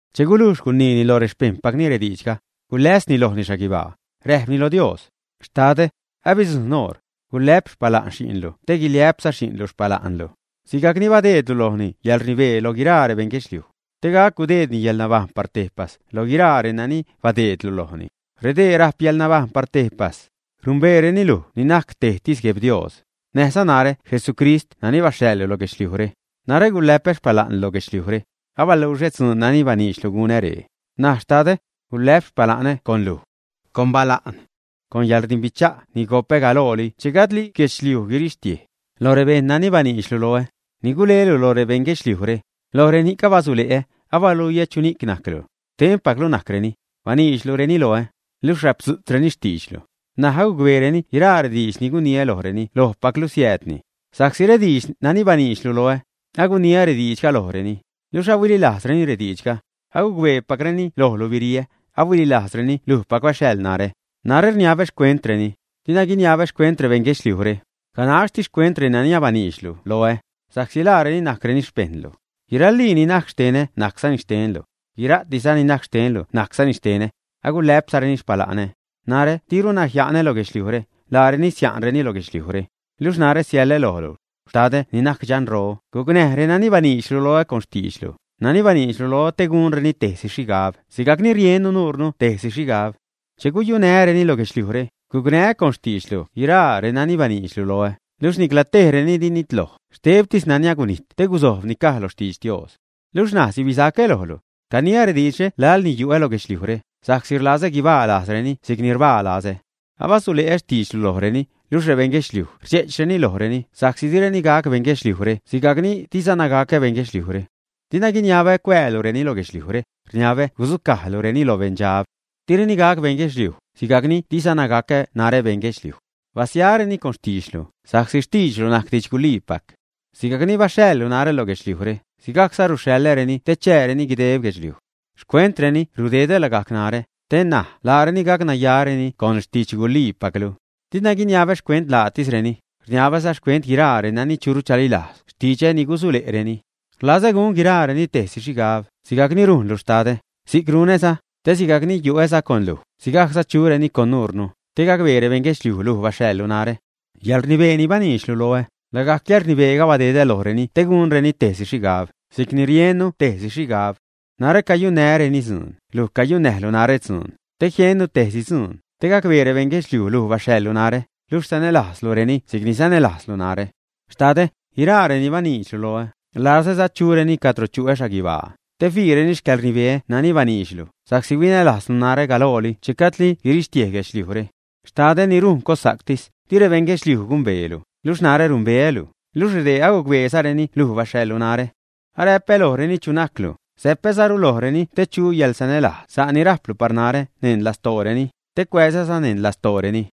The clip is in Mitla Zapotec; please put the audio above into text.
Che gulujx guniini loj rexpejṉpacni rediidxga, guläsni lojni xhaguibaa, räjpni lo Dios: ―Xtadä, abidzujṉ oṟ; gulä'p xpala'n xi'nlu te guiliä'pza xi'nlu xpala'nlu, sigajc ni badeedlu lojni yäḻrnibee loj guiraa rebeṉ guedxliuj, te gac gudeedni yälnabajṉ par tejpas lo guiraa renani badeedlu lojni. Redee rajp yäḻnabajṉ par tejpas; numbeereni luj ni najc tejtis GuebDios, näjza narä Jesucrist nani baxhaḻlu lo guedxliujre. ’Narä gulä'pä xpala'nlu lo guedxliujre, abaluxä dzuun nani baniidxlu gunä ree. N̲aj Xtadä, gulä'p xpala'nä con luj, con bala'n, con yäḻrdimbicha' ni gopä galooli che gajdli guirixtiej guedxliuj. ’Loj rebejṉ nani baniidxlu loä, ni gulelu lo rebeṉ guedxliujre, loj reni'c abasule'ä, abaluiä chu najclu. Xtenpaclu najcreni, baniidxlureni loä, luxh rapdzu'tzreni xtiidxlu. N̲aj agucbeereni guiraa rediidx ni guniä lojreni lojpaclu siäädni. Sa'csi rediidx nani baniidxlu loä, aguniä rediidxga lojreni, luxh ahuililajzreni rediidxga, agucbeepacreni lojlu biriä, ahuililajzreni lujpac baxhaḻ narä. ’Narä rniabä xcuentreni, dina guiniabä xcuent rebeṉ guedxliujre, ganaxtis xcuent renani abaniidxlu loä, sa'csi laareni najcreni xpejṉlu. Guiralii ni najc xtenä, najczani xtenlu. Guira'tiza ni najc xtenlu najczani xtenä. Agulä'pzareni xpala'nä. ’Narä diruna jia'nä lo guedxliujre, laareni sia'nrureni lo guedxliujre. Luxh narä siäḻä lojlu. Xtadä ni najc Dxanro, gucnäj renani baniidxlu loä con xtiidxlu, nani baniidxlu loä te gunreni tejsi xhigab sigajcni riennu nurnu tejsi xhigab. Che guyunää́reni lo guedxliujre, gucnää́ con xtiidxlu guiraa renani baniidxlu loä, luxh nicla tejreni di ninitloj, xtebtis nani gunijt te gusojb ni caj lo xtidx Dios. ’Luxh ṉaj sibisacä lojlu. Caniä rediidxre laḻ ni yu'ä lo guedxliujre, sa'csi rlazä guibaa lajzreni si'c ni rbaa lazä. Abasule'ä xtiidxlu lojreni, luxh rebejṉ guedxliuj rdxe'chreni lojreni sa'csi direni gac bejṉ guedxliujre sigajc ni dizana gacä bejṉ guedxliujre. Dina guiniabä cuäälureni lo guedxliujre, rniabä gudzucajlureni loj beṉdxab. Direni gac bejṉ guedxliuj, sigajc ni dizana gacä narä bejṉ guedxliuj. Basyareni con xtiidxlu, sa'csi xtiidxlu najc didxguliipac. Sigajc ni baxhaḻlu narä lo guedxliujre, sigajcza ruxhaḻäreni te chääreni guideb guedxliuj. Xcuentreni rudedä lagajc narä, te näj laareni gacnayareni con xtidxguliipaclu. Dina guiniabä xcuent laatisreni, rniabäza xcuent guiraa renani churu chalilajz xtidxä ni gusule'reni. Rlazä gun guiraareni tejsi xhigab, sigajc ni rujnlu, Xtadä, si'c runäza; te sigajc ni yu'äza con luj, sigajcza chureni con nuurnu, te gacbee rebeṉ guedxliuj luj baxhaḻlu narä. Yäḻrnibee ni baniidxlu loä, lagajc yäḻrnibeega badedä lojreni te gunreni tejsi xhigab, si'cni riennu tejsi xhigab. Narä cayunnää́reni dzuun, luj cayunnäjlu narä dzuun, te jiennu tejsi dzuun, te gacbee rebejṉ guedxliuj luj baxhaḻlu narä, luxh sanälajzlureni si'cni sanälajzzalu narä. ’Xtadä, guiraa renani baniidxlu loä, rlazäza chureni cadro chuä xhaguibaa, te fiireni xcäḻrnibeä nani baniidxlu, sa'csi huinälajzlu narä galooli che gajdli guirixtiej guedxliujre. Xtadä ni rujn cossa'ctis, di rebejṉ guedxliuj gumbeelu, luxh narä numbeälu, luxh redee agucbeezareni luj baxhaḻlu narä. Aräpä lojreni chu najclu; säpäzaru lojreni te chu yäḻsanälajz sa' ni rajplu par narä neṉ lastooreni, te cuäzäza neṉ lastooreni.